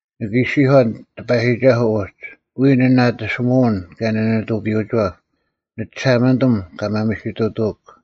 ᓂᑭ ᐃᔅᒋᔄᓐ ᑎᐸᔨᒋᒐᓱᐤ ᐅᒡ, “ᐎᔾ ᓂ ᓇᑎᓯᒧᐅᓐ ᑭᔭ ᓂᓂᑐᐱᔪᐅᒋᐛᑉ; ᓂᒋᓴᒪᓂᑐᒻ, ᑲ ᒪᒥᓯᑐᑐᐅᒄ᙮”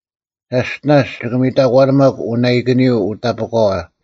ᒐᔅᑎᓇᔅ ᒋᑭ ᒥᑕᒂᓇᒪᒄ ᐅᓇᐃᑭᓂᔪᐤ ᐅᑕᐸᒂᐛ,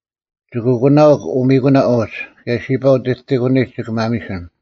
ᒋᑭ ᐊᒂᓇᐅᒄ ᐅᒥᑯᓇ ᐅᒡ, ᑭᔭ ᓯᐸ ᐅᑎᑎᑭᓂᒡ ᒋᑭ ᒪᒥᓯᓐ: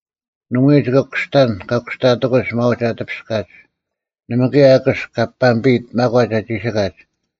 ᓇᒪᐎᔾ ᒋᑭ ᑯᔅᑕᓐ ᑲ ᑯᔅᑕᑎᒂᒡ ᒪᒂᒡ ᐊ ᑎᐱᔅᑲᒡ: ᓇᒪ ᑭᔭ ᐊᑭᔅᒄ ᑲ ᐱᒥᐱᔨᑦ ᒪᒂᒡ ᐊ ᒋᓯᑲᒡ;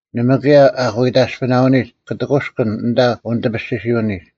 ᓇᒪ ᑭᔭ ᐊᐧᑯᐃᑕᔅᐱᓇᐅᓂᒡ ᑲ ᑎᑯᔅᑭᓐ ᐊᓐᑕ ᐅᓂᑎᐱᔅᒋᓯᐅᓂᒡ,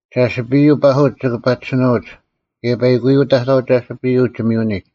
ᒐᓯᐱᔪᐤ ᐸᓱᒡ ᒋᑭ ᐸᒋᓯᓄᐅᒡ, ᑭᔭ ᐸᐃᑯᔪᐤ ᑕᑥᐤ ᒐᓯᐱᔪᐤ ᒋᒥᔪᐅᓂᒡ;